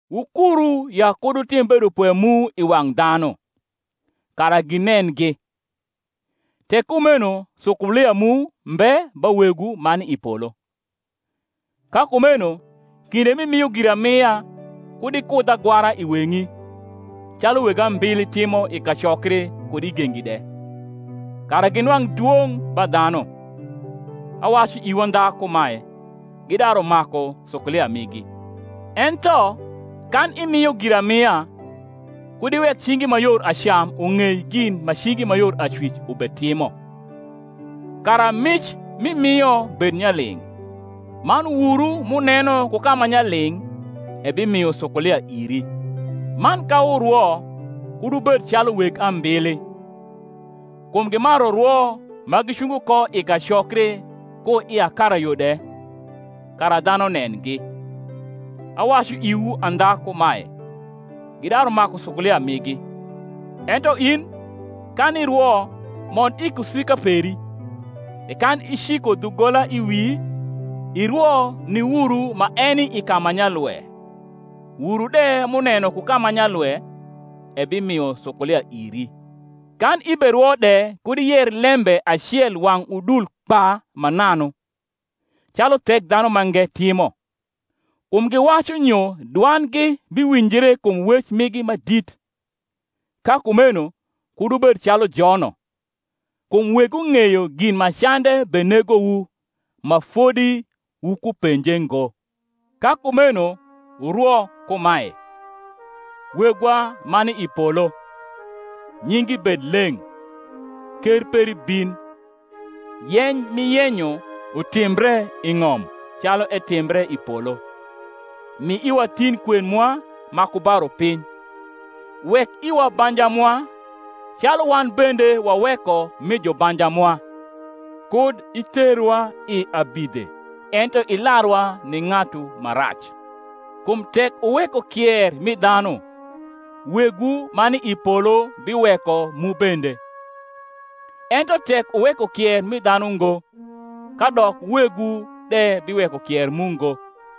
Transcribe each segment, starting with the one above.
Wukuru ya kud wutim bedopwe mu i wang’ dhanu, kara ginengi: tek kumeno sukulia mu mbe ba Wegwu ma ni i polo. Ka kumeno kinde m’imio giramia kud ikudh agwara i weng’i, calu weg ambili timo i kacokri kud i gengi de, kara ginwang’ dwong’ ba dhanu. Awacu iwu andha kumae, Gidaru maku sukulia migi. Ento kan imio giramia, kud iwek cingi ma yor acam ung’ei gin ma cingi ma yor acwic ubetimo: kara mic m’imio bed nyaling’: man Wuru m’uneno ku ka ma nyaling’ ebimio sukulia iri. Man ka wurwo kud wubed calu weg ambili: kum gimaru rwo ma gicungo ko i kacokri ku i akarayo de, kara dhanu nengi. Awacu iwu andha kumae, Gidaru maku sukulia migi. Ento in, kan irwo, mond i kusika peri, e kan iciko dhugola i wii, irwo ni Wuru ma eni i ka ma nyalwe, Wuru de m’uneno ku ka ma nyalwe ebimio sukulia iri. Kan iberwo de kud iyer lembe acel wang’ udul kpa mananu, calu Thekdhanumange timo: kum giwacu nyo dwandgi biwinjre kum wec migi ma dit. Ka kumeno kud wubed calu jono: kum Wegwu ng’eyo gin ma cande benegowu, ma fodi wukupenje ngo. Ka kumeno wurwo kumae, Wegwa ma ni i polo, Nyingi bed leng’. Ker peri bin, Yeny m’iyenyo utimbre i ng’om calu etimbre i polo. Mi iwa tin kwen mwa ma ku ba rupiny. Wek iwa banja mwa, calu wan bende waweko mi jubanja mwa. Kud iterwa i abidhe ento ilarwa ni ng’atu ma rac. Kum tek wuweko kier mi dhanu, Wegwu ma ni i polo biweko mu bende. Ento tek wuweko kier mi dhanu ngo, kadok Wegwu de biweko kier mu ngo.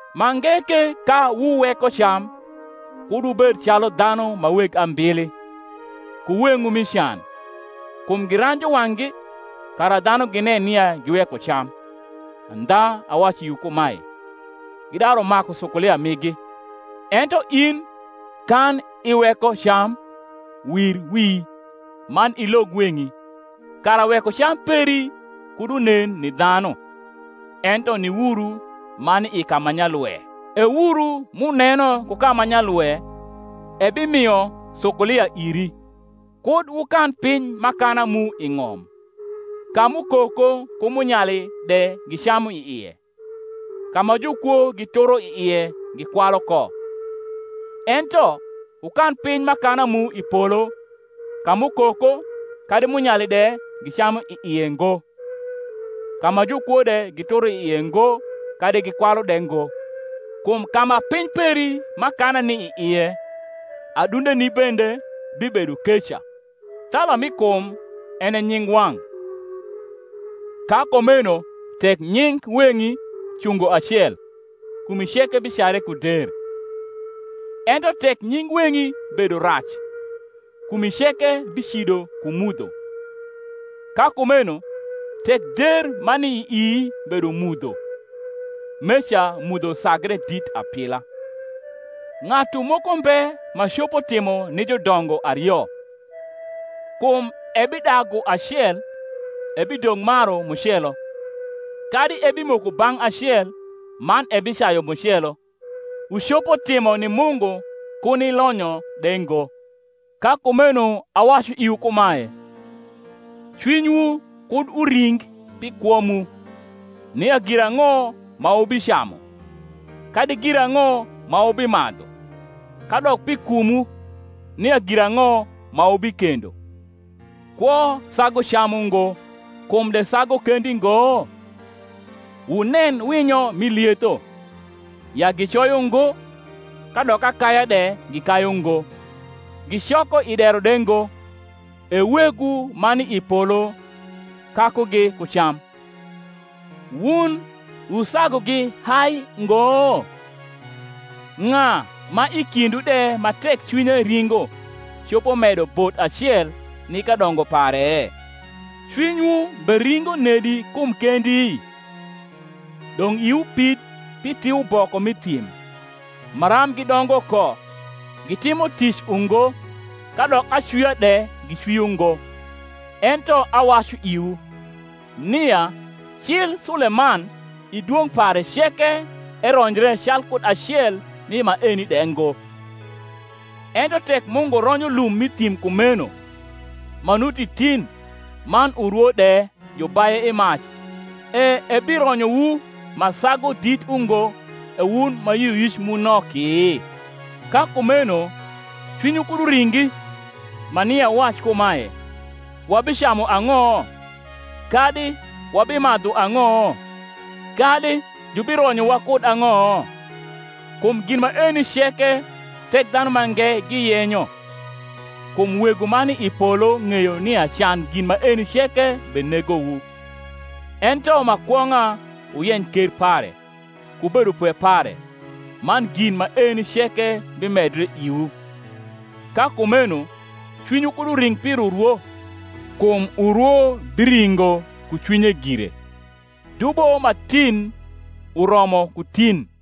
Mange ke ka wuweko cam, kud wubed, calu dhanu ma weg ambili, ku weng’wu mi can: kum giranju wang’gi, kara dhanu ginen nia giweko cam. Andha awacu iwu kumae, Gidaru maku sukulia migi. Ento in, kan iweko cam, wir wi, man ilog weng’i; kara wekocam peri kud unen ni dhanu, ento ni Wuru ma ni i ka ma nyalwe: e Wuru, m’uneno ku ka ma nyalwe, ebimio sukulia iri. Kud wukan piny m’akana mu i ng’om, ka m’ukoko ku munyali de gicamu i ie, ka ma jukwo gituro i ie gikwalu ko: ento wukan piny m’akana mu i polo ka m’ukoko kadi munyali de gicamu i ie ngo, ka ma jukwo de gituro i ie ngo kadi gikwalu de ngo: kum ka ma piny peri m’akana ni i ie, adundeni bende bibedo keca. Thala mi kum en e nyingwang’: ka kumeno tek nying weng’i cungo acel, kumi ceke bicare ku der. Ento tek nying weng’i bedo rac, kumi ceke bicido ku mudho. Ka kumeno tek der ma ni ii bedo mudho, meca mudho sagre dit apila! Ng’atu moko mbe ma copo timo ni judongo ario: kum ebidagu acel, ebidong’ maru mucelo; kadi ebimoko bang’ acel, man ebicayu mucelo. Wucopo timo ni Mungu ku ni lonyo de ngo. Ka kumeno awacu iwu kumae, Cwinywu kud uring pi kwo mu, nia girang’o ma wubicamu, kadi girang’o ma wubimadhu; kadok pi kumwu, nia girang’o ma wubikendo. Kwo sagu cam ungo, kum de sagu kendi ngo? Wunen winyo m’i lietho, ya gicoyo ngo, kadok akaya de gikayu ngo, gicoko i dero de ngo; e Wegwu ma ni i polo kakugi ku cam. Wun wusagugi hai ngo? Ng’a ma i kindwu de ma tek cwinye ringo copo medo bot acel ni kadongo pare? Cwinywu beringo nedi kum kendi? Dong’ iwu pid pi thiuboko m’i thim, maram gidongo ko; gitimo tic ungo, kadok acwia de gicwio ngo: ento awacu iwu, nia cil Suleman i dwong’ pare ceke eronjre calkud alcel mi maeni de ngo. Ento tek Mungu ronyo lum m’i thim kumeno, ma nuti tin, man urwo de jubaye i mac, e ebironyowu ma sagu dit ungo, E wun ma yioyic mu noki? Ka kumeno cwinywu kud uringi, ma nia wuwac kumae, Wabicamu ang’o? kadi, Wabimadhu ang’o? kadi, Jubironyowa kud ang’o? Kum gin maeni ceke Thekdhanumange giyenyo; kum Wegwu ma ni i polo ng’eyo nia can gin maeni ceke benegowu. Ento ma kwong’a wuyeny ker pare, ku bedopwe pare; man gin maeni ceke bimedre iwu. Ka kumeno cwinywu kud uring pir urwo: kum urwo biringo ku cwinye gire. Dubo ma tin uromo ku tin.